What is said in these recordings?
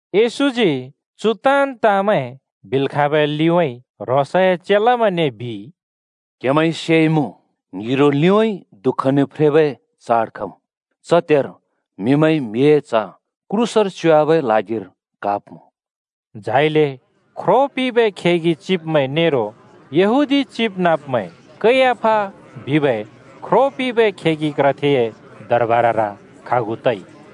येशूजी चु ताँन् ताँमैं बिल् खाँबै लिउँइँ ह्रोंसए चेलामैंने बिइ, “क्‍हेमैंइ सेइमुँ, ङ्हिरो लिउँइँ दुःखने फ्रेबै चाड खमुँ। च त्हेर म्हिमैंइ म्हिए च्ह क्रूसर च्‍योवाबै ल्हागिर क्हाब्‍मुँ।” झाइले ख्रो पिंबै खेगि चिब्मैं नेरो यहूदी चिबनाँब्मैं कैयाफा बिबै ख्रो पिंबै खेगि क्रथेए दरबारर खागु तइ।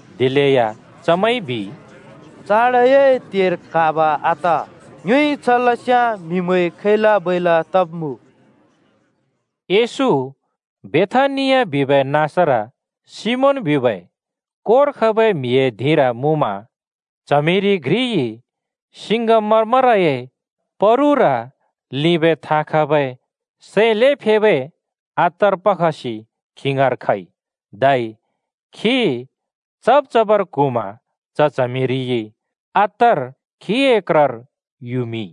दिलेया चमैंइ बिइ, “चाडए त्हेर क्‍हाब आत। ङ्योइ छ लस्‍याँ म्‍हिमैं खैला-बैला तब्मुँ।” येशू बेथानिया बिबै नाँसर सिमोन बिबै कोर खबै म्हिए धिंर मुँमा, च्हमिरि घ्रिइ सिङ्गमरमरए परुर लिंबै थाँ खबै सै ल्हें फेबै अत्तर पखसि खी ङाँर खइ। धै खी चब् चबर क्हुँमा च च्हमिरिइ अत्तर खीए क्रर युमिंइ।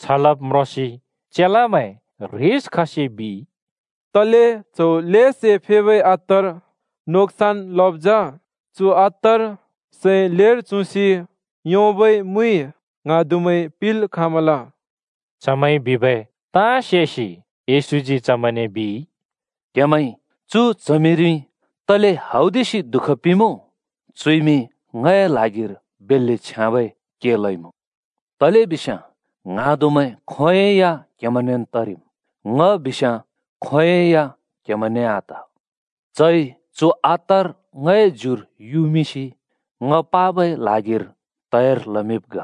छ लब् म्रोंसि चेलामैं ह्रिस खसि बिइ, “तले च्हौ ल्हें सै फेबै अत्तर नोक्सन लब् जा? चु अत्तर सै ल्हेर चुँसि योंबै मुइ ङ्हाँदुमैं पिंल् खाँमल।” चमैंइ बिबै ताँ सेसि येशूजी चमैंने बिइ, “क्‍हेमैंइ चु च्हमिरि तले हौदिसि दुःख पिंमुँ? चुइमि ङए ल्हागिर बेल्‍ले छ्याँबै के लइमुँ। तलेबिस्याँ ङ्हाँदुमैं खोंयोंइ या क्हेमैंनेन् तरिम्। ङ बिस्याँ खोंयोंइ या क्‍हेमैंने आत। चइ चु अत्तर ङए ज्युर युमिंसि ङ पाबै ल्हागिर तयार लमिंब् ग।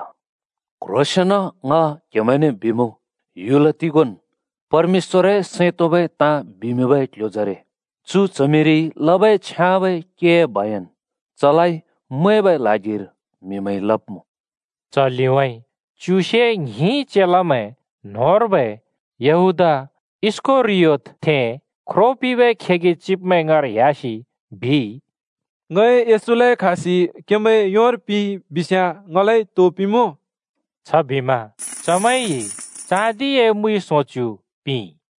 क्ह्रोंसेंन ङ क्हेमैंने बिमुँ, ह्‍युल तिगोंन् परमेश्‍वरए सैं तोंबै ताँ बिमिंबै क्ल्ह्‍योजरे चु च्हमिरिइ लबै छ्याँबै केए बयन चलाइ मैंबै ल्हागिर म्‍हिमैंइ लब्‍मुँ।” च लिउँइँ च्युसे ङ्हिं चेलामैं न्‍होंर्बै यहूदा इस्‍करियोतथें ख्रो पिंबै खेगि चिब्मैं ङाँर ह्‍यासि बिइ, “ङइ येशूलाइ क्हासि क्हेमैंए योर पिंइ बिस्‍याँ ङलाइ तो पिंमुँ?” छबिमा चमैंइ चाँदिए मुइ सोंच्‍यु पिंइ।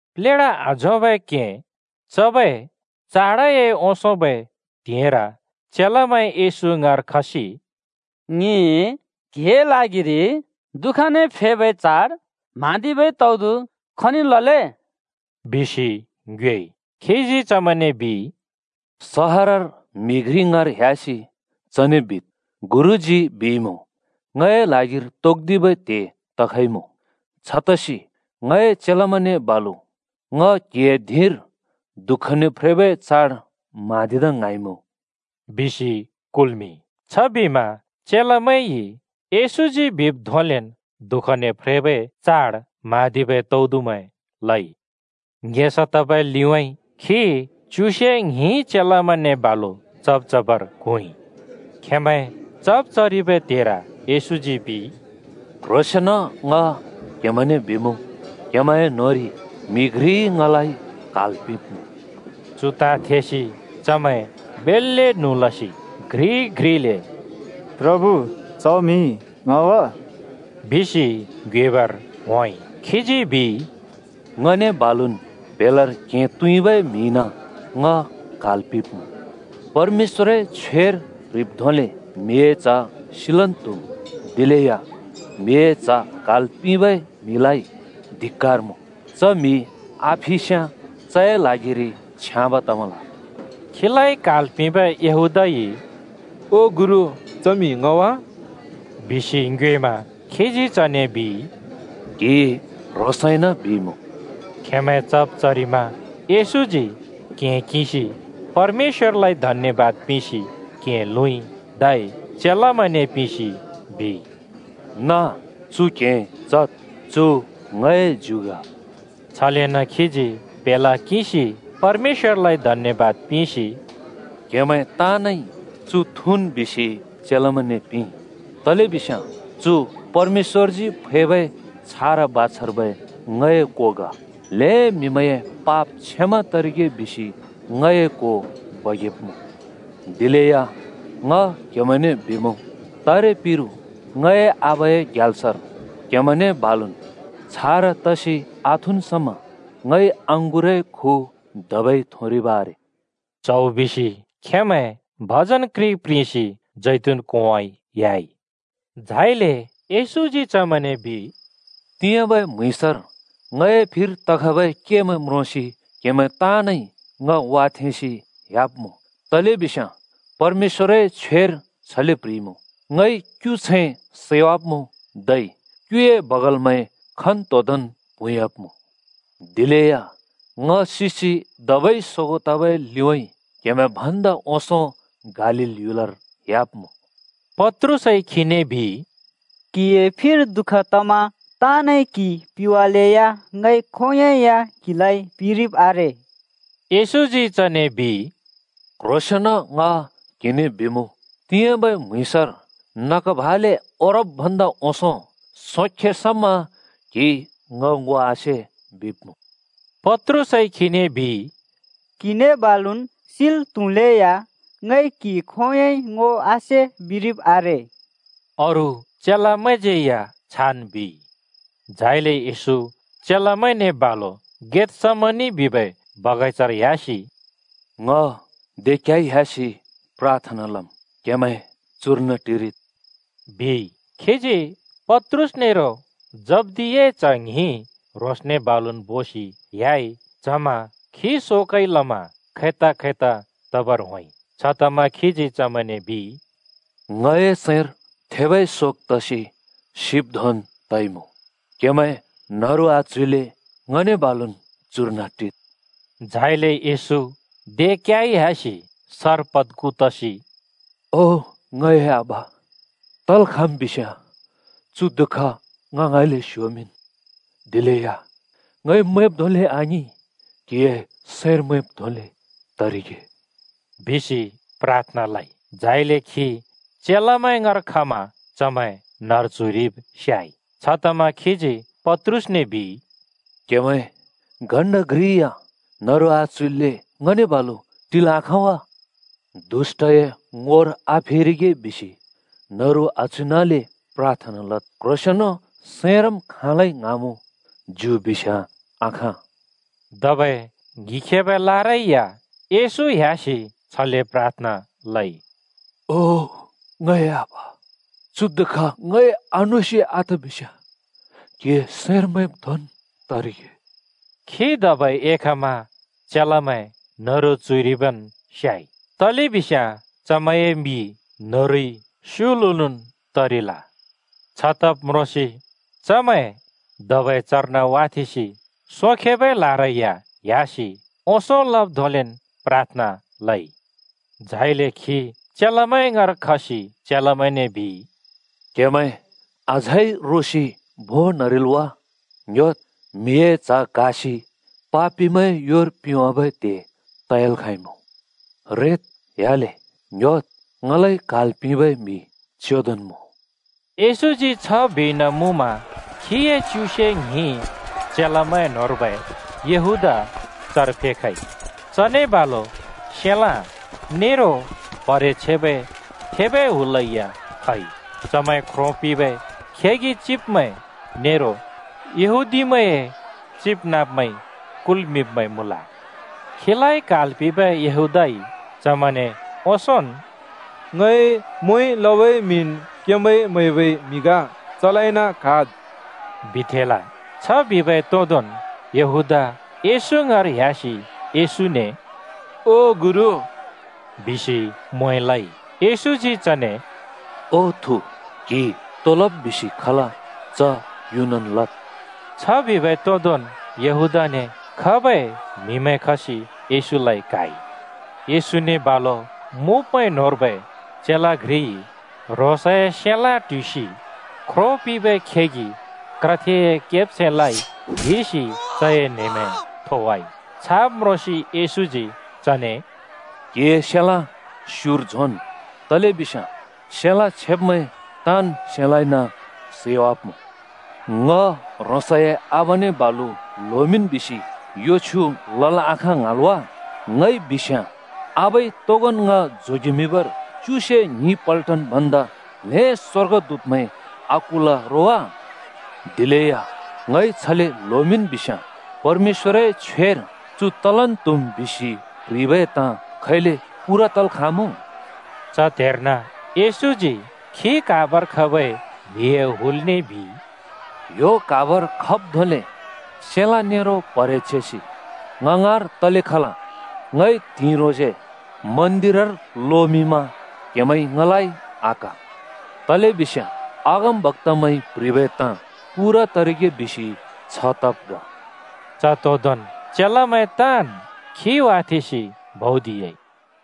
प्लेढा आझोंबै क्हें चबै चाडए ओंसोंबै त्हिंइर चेलामैं येशू ङाँर खसि “ङिइ क्हिए ल्हागिरि दुःखने फ्रेबै चाड म्हाँदिबै तौदु खनिर लले?” बिसि ङ्योएइ। खीजी चमैंने बिइ, “सहरर म्‍हि घ्रि ङाँर ह्‍यासि चने बिद्, गुरुजी बिइमुँ, ‘ङए ल्हागिर तोक्दिबै त्हे तखइमुँ। छतसि ङए चेलामैंने बालु ङ क्‍हिए धिंर दुःखने फ्रेबै चाड म्हाँदिदा ङ्हाँइमुँ,’ बिद्।” बिसि कुल्मिंइ। छबिमा चेलामैंइ येशूजी बिब् धोंले दुःखने फ्रेबै चाड म्हाँदिबै तौदुमैं लइ। ङेसा तबै लिउँइँ खी च्युसे ङ्हिं चेलामैंने बालु चब् चबर क्हुँइ। खेंमैं चब् चरिबै त्हेर येशूजी बिइ, “क्ह्रोंसेंन ङ क्‍हेमैंने बिमुँ, क्हेमैंए न्होंरि म्‍हि घ्रिइ ङलाइ क्हाल् पिंब्मुँ।” चु ताँ थेसि चमैं बेल्‍ले न्हुँ लसि घ्रि-घ्रिले “प्रभु, च म्हि ङ वा?” बिसि ङ्योएबर होंइ। खीजी बिइ, “ङने बालुन् प्‍हेलार क्‍हें तुइँबै म्हिइन ङ क्हाल् पिंब्‍मुँ। परमेश्‍वरए छ्वेर प्‍ह्रिब् धोंले म्हिए च्ह सिलन् त्‍हुम्, दिलेया म्हिए च्ह क्हाल् पिंबै म्हिलाइ धिक्‍कार मुँ। च म्हि आफिस्याँ चए ल्हागिरि छ्याँब तमल।” खीलाइ क्हाल् पिंबै यूहदाइ “ओ गुरु, च म्हि ङ वा?” बिसि ङ्योएमा खीजी चने बिइ, “क्‍हिइ ह्रोंसइन बिइमुँ।” खेंमैं चब् चरिमा येशूजी क्‍हें किंसि परमेश्‍वरलाइ धन्यबाद पिंसि क्‍हें लुँइ, धै चेलामैंने पिंसि बिइ, “नाँ, चु क्‍हें चद्! चु ङए ज्यु ग।” छलेन खीजी प्‍हेला किंसि परमेश्‍वरलाइ धन्‍यबाद पिंसि “क्हेमैं ताँनइ चु थुँन् बिसि चेलामैंने पिंइ। तलेबिस्याँ चु परमेश्‍वरजी फैबै छारा बाछार्बै ङए को ग। ल्‍हें म्‍हिमैंए पाप क्षमा तरिगे बिसि ङए को बगेब्मुँ। दिलेया ङ क्हेमैंने बिमुँ, तारे पिरु ङए आबाए ग्याल्सर क्हेमैंने बालुन् छारा तरिकाले आथुँन् समा ङइ अँगुरए खु धबै थुँरिब आरे।” च्हौ बिसि खेंमैं भजन घ्रि प्रिंसि जैतून कोंउँइँ ह्‍याइ। झाइले येशूजी चमैंने बिइ, “तिंयाँबै म्‍हुँइँसर ङए फिर तखबै केमैं म्रोंसि क्‍हेमैं ताँनइ ङ वाथेंसि ह्‍याब्‍मुँ। तलेबिस्याँ परमेश्‍वरए छ्वेर छले प्‍ह्रिइमुँ, ‘ङइ क्युछैं सैवाब्‍मुँ, धै क्‍युए बगालमैं खन्‍तोंदोंन् प्हुँयाब्‍मुँ।’ दिलेया ङ सिसि धबै सोगों तबै लिउँइँ क्‍हेमैं भन्दा ओंसों गालील ह्‍युलर ह्‍याब्‍मुँ।” पत्रुसइ खीने बिइ, “क्हिए फिर दुःख तमा ताँनइ क्‍हि पिवालेया ङइ खोंयोंइ या क्हिलाइ पिरिब् आरे।” येशूजी चने बिइ, “क्ह्रोंसेंन ङ क्हिने बिमुँ, तिंयाँबै म्‍हुँइँसर नग भाले ओरब् भन्दा ओंसों सोंखे समा क्‍हिइ ङ ङो आसे बिब्मुँ।” पत्रुसइ खीने बिइ, “क्‍हिने बालुन् सिल् त्‍हुलेया ङइ क्हि खोंयोंइ ङो आसे बिरिब आरे।” अरू चेलामैंज्यै या छान् बिइ। झाइले येशू चेलामैंने बालु गेतसमनि बिबै बगैंचार ह्‍यासि “ङ दे क्याइ ह्‍यासि प्राथना लमुँ। क्‍हेमैं चुर्न टिरिद् ओ,” बिइ। खीजी पत्रुस नेरो जब्दियाए च्‍ह ङ्हिं ह्रोंसने बालुन् बोसि ह्‍याइ, च्हमा खी शोकइ लमा खैता खैता तबर होंइ। छतमा खीजी चमैंने बिइ, “ङए सैंर थेबै शोक तसि सिब् धोंन् तइमुँ। क्‍हेमैं न्हरु आच्हुल्‍ले ङने बालुन् चुर्न टिद्।” झाइले येशू दे क्‍याइ ह्‍यासि सर पद्खु तसि “ओ ङए आबा, तल् खाँम् बिस्‍याँ चु दुःख ङ ङाँइँले स्‍योमिंन्। दिलेया ङइ मैंब् धोंले आङिं, क्‍हिए सैंर मैंब् धोंले तरिगे,” बिसि प्राथना लइ। झाइले खी चेलामैं ङाँर खमा चमैं न्‍हरु च्‍हुइरिब स्‍याइ। छतमा खीजी पत्रुसने बिइ, “क्‍हेमैं घण्‍टा घ्रि या न्हरु आच्हुइल्‍ले ङने बालु टिल् आखाँ वा? दुष्‍टए ङोर आफेरिगे बिसि न्हरु आच्हुइनाले प्राथना लद्। क्ह्रोसेंन सैंरम् खाँलै ङ्हाँमुँ, ज्यु बिस्याँ आखाँ।” धबै ङ्हिखेबै लारै या येशू ह्‍यासि छले प्राथना लइ, “ओ ङए आबा, चु दुःख ङइ आनोसि आत बिस्याँ क्‍हिए सैंर मैंब् धोंन् तरिगे।” खी धबै एखमा चेलामैं न्‍हरु च्‍हुइरिबन् स्‍याइ, तलेबिस्याँ चमैंए मि न्‍हरुइ स्युलुलुन् तरिल। छ तब् म्रोंसि चमैं धबै चर्न वाथेंसि सोंखेबै लारै या ह्‍यासि ओंसों लब् धोंलेन् प्राथना लइ। झाइले खी चेलामैं ङाँर खसि चेलामैंने बिइ, “क्‍हेमैं अझै रोसि भोंन् न्हरिल् वा? ङ्‌ह्‍योद्, म्हिए च्ह क्‍हासि ‍पापिमैंए योर पिंवाबै त्हे तयाल् खाँइमुँ। रेद्, ह्‍याले। ङ्‍ह्‍योद्! ङलाइ क्हाल् पिंबै म्‍हि चेंदोन् मुँ।” येशूजी छ बिइन मुँमा खीए च्युसे ङ्हिं चेलामैं न्‍होंर्बै यहूदा चर फेखइ। चने बालु सेलाँ (तरवार) नेरो प्‍हरे छेबै थेबै हुलै या खइ। चमैं ख्रो पिंबै खेगि चिब्मैं नेरो यहूदीमैंए चिबनाँब्मैंइ कुल्‍मिंब्‍मैं मुँल। खीलाइ क्हाल् पिंबै यहूदाइ चमैंने ओंसोंन् “ङइ म्वें लबै म्हिन् क्‍हेमैंइ म्‍हैबै म्‍हि ग। चलाइन क्‍हाद्,” बिथेंल। छ बिबै तोदोंन् यहूदा येशू ङाँर ह्‍यासि येशूने, “ओ गुरु,” बिसि म्वें लइ। येशूजी चने “ओ थु, क्हि तो लब् बिसि खल, च युनन् लद् बिइ,” छ बिबै तोदोंन् यहूदाने खबै म्‍हिमैं खसि येशूलाइ क्‍हाइ। येशूने बालु मुँब्मैं न्होंर्बै चेला घ्रिइ ह्रोंसए सेलाँ ट्हुइसि ख्रो पिंबै खेगि क्रथेए केब्छैंलाइ ल्हिसि चए न्‍हेमें थोवाइ। छाब् म्रोंसि येशूजी चने “क्‍हिए सेलाँ स्युर झोंन् बिइ, तलेबिस्याँ सेलाँ छेब्मैं ताँन् सेलाँइन सैवाब्‍मुँ। ङ ह्रोंसए आबाने बालु ल्होमिंन् बिसि यो छ्युँ लल् आखाँ ङ्हाँल् वा? ङइ बिस्याँ आबाइ तोगोंन् ङ जोगेमिंबर च्युसे ङ्हिं पल्टन भन्दा ल्हें स्‍वर्गदूतमैं आकुल रो वा? दिलेया ङइ छले ल्होमिंन् बिस्याँ, परमेश्‍वरए छ्वेर चु तलन् त्हुम् बिसि प्ह्रिबै ताँ खैले पूरा तल् खाँमुँ?” च त्हेर्न येशूजी खी क्‍हाबर खबै म्हिए हुलने बिइ, “ह्‍यो क्हाबर खब् धोंले सेलाँ नेरो प्‍हरे छेसि ङ ङाँर तले खल? ङइ त्हिंइ ह्रोंसे मन्दिरर लोमिंममा क्‍हेमैंइ ङलाइ आक्‍हा। तलेबिस्याँ अगमबक्‍तामैंइ प्‍ह्रिबै ताँ पूरा तरिगे बिसि छ तब् ग।” च तोदोंन् चेलामैं ताँन् खी वाथेंसि भौदिह्‍याइ।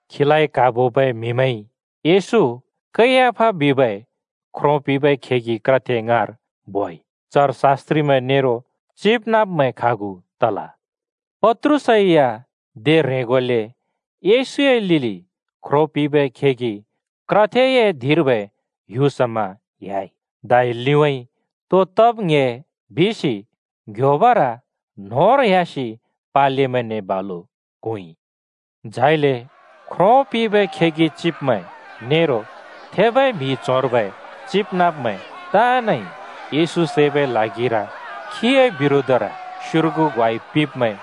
खीलाइ क्‍हाबोबै म्‍हिमैंइ येशू कैयाफा बिबै ख्रो पिंबै खेगि क्रथे ङाँर बोइ। चर शास्‍त्रिमैं नेरो चिबनाँब्मैं खागु तल। पत्रुस या दे ह्रेंगोले येशूए लिलि ख्रो पिंबै खेगि क्रथेए धिंर्बै ह्‍यु समा ह्‍याइ। धै “लिउँइँ तो तमगे” बिसि ङ्‌ह्‍योबर न्होंर होंसि पालेमैंने बालु क्हुँइ। झाइले ख्रो पिंबै खेगि चिब्मैं नेरो थेबै म्हि च्होंर्बै चिबनाँब्मैं ताँनइ येशू सैबै ल्हागिर खीए बिरोधर स्‍योर्गु ग्वाइ पिब्‍मैं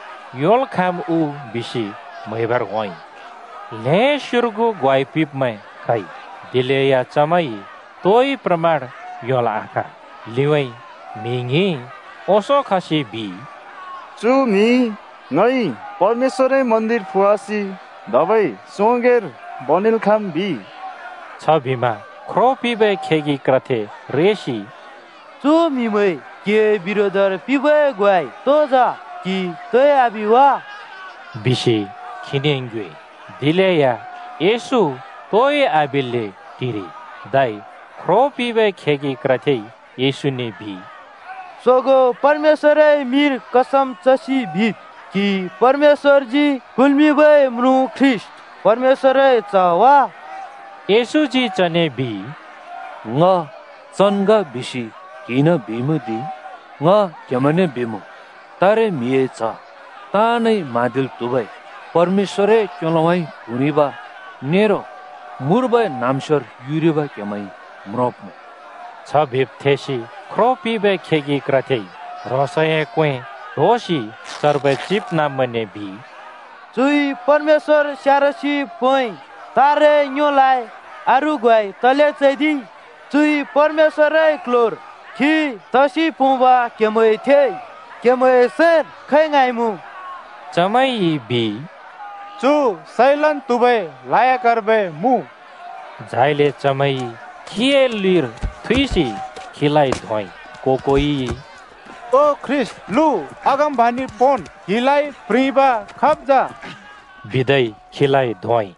योंल् खाँम् उ बिसि म्‍हैबर होंइ। ल्‍हें स्योर्गु ग्वाइ पिंब्मैं खइ, दिलेया चमैंइ तोइ प्रमाण योंल् आखाँ। लिउँइँ म्हि ङ्हिं ओंसों खसि, बिइ। “चु म्‍हिइ ‘ङइ परमेश्‍वरए मन्दिर फुवासि धबै सोंगैंर बनेल् खाँम्,’ बिइ।” छबिमा ख्रो पिंबै खेगि क्रथे रेसि “चु म्हिमैंइ क्‍हिए बिरोधर पिंबै ग्वाइ तो जा? क्‍हि तोइ आबि वा?” बिसि खीने ङ्योएइ। दिलेया येशू तोइ आबिल्‍ले टिरिइ। धै ख्रो पिंबै खेगि क्रथेइ येशूने बिइ, “सोगों परमेश्‍वरए मिंर कसम चसि बिद्। क्‍हि परमेश्‍वरजी कुल्मिंबै म्रुँ ख्रीष्‍ट, परमेश्‍वरए च्‍ह वा?” येशूजी चने बिइ, “ङ चन् ग बिसि क्‍हिइन बिइमुँ दि। ङ क्हेमैंने बिमुँ, तारे म्हिए च्ह ताँनइ म्हाँदिल् त्हुबै परमेश्‍वरए क्‍योलोउँइँ क्हुँरिब नरो मुर्बै न्‍हाँम्‍स्योर युरिब क्‍हेमैंइ म्रोंब्‍मुँ।” छ बिब् थेसि ख्रो पिंबै खेगि क्रथेइ ह्रोंसए क्‍वें ट्होसि चर्बै चिबनाँब्मैंने बिइ, “चुइ परमेश्‍वर स्यारसि पोंइ। तारे ङ्योलाइ अरू ग्वाइ तले चैदिइ? चुइ परमेश्‍वरए क्ल्ह्‍योर खी तसि पोंब क्हेमैंइ थेइ। क्‍हेमैंए सैंर खै ङ्हाँमुँ?” चमैंइ बिइ, “चु सैलन् त्‍हुबै लायकर्बै मुँ।” झाइले चमैंइ खीए लिर थुइसि खीलाइ धोंइ। को-कोइइ, “ओ ख्रीष्‍ट, लु, अगमबाणि पोंन्! क्हिलाइ प्रिंब खाब् जा?” बिदै खीलाइ धोंइ।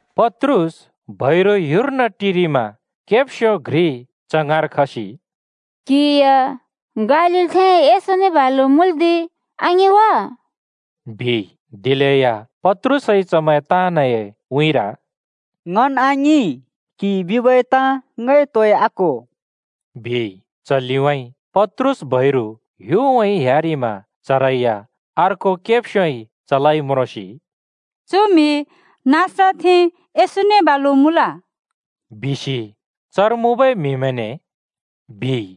पत्रुस बैरु ह्‍युर्न टिरिमा केब्स्यो घ्रि च ङाँर खसि “क्‍हि या गालीलथें येशूने बालु मुँल्दि आङि वा,” बिइ। दिलेया पत्रुसइ चमैं ताँनए उँइँर “ङन् आङिं! क्‍हिइ बिबै ताँ ङइ तोइ आक्हो,” बिइ। च लिउँइँ पत्रुस बैरु ह्‍युउँइँ ह्‍यारिमा चरै या अर्को केब्स्योइ चलाइ म्रोंसि “चु म्‍हि नासरतथें येशूने बालु मुँल बिसि चर मुँबै म्‍हिमैंने,” बिइ।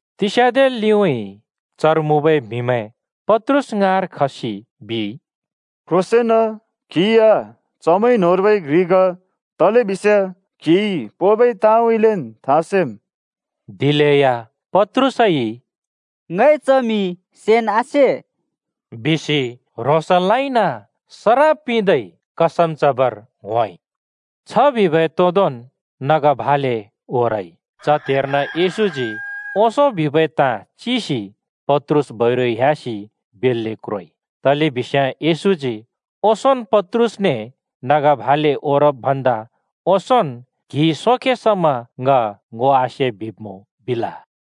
तिस्याँदे लिउँइँ चर मुँबै म्‍हिमैं पत्रुस ङाँर खसि बिइ, “क्ह्रोंसेंन, क्हि या चमैं न्‍होंर्बै घ्रि ग, तलेबिस्याँ क्‍हिइ पोंबै ताँउँइँलेन् था सेम्।” दिलेया पत्रुसइ “ङइ च म्हि सेन् आसे बिसि ह्रोंसलाइन सराप पिंदै कसम चबर होंइ।” छ बिबै तोदोंन् नग भाले ओरइ। च त्हेर्न येशूजी ओंसों बिबै ताँ चिसि पत्रुस बैरु ह्‍यासि बेल्‍ले क्रोइ। तलेबिस्याँ येशूजी ओंसोंन् पत्रुसने “नग भाले ओरब् भन्दा ओंसोंन् क्‍हिइ सोंखे समा ङ ङो आसे बिब्‍मुँ,” बिल।